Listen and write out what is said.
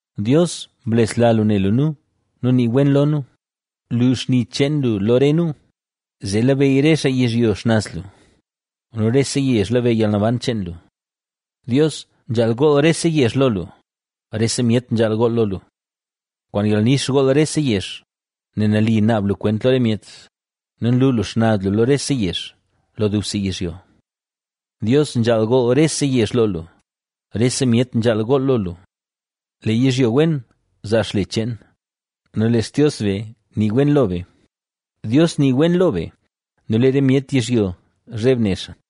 Dios, blesla lu ne lu nu nu nii wen lo nu; lu xni cheen lu lo re nu, Zee labeyy re xaa yizhyo xnaz lu nu rese yezh labeyy yalnaban cheen lu. Dios, nzhaal gool rese yezh lo lu, rese myet nzhaal gool lo lu. Kwaan yalnix gool rese yezh, nel nali naab lu kwent lo re myet nu nlu lu xnaz lu lo rese yezh, lo dubse yizhyo. Dios, nzhaal gool rese yezh lo lu, rese myet nzhaal gool lo lu. Lee yizhyo wen zaa xle cheen nu lee Xtios be nii wen lo be, Dios nii wen lo be nu lee re myet yizhyo zheb ne xaa.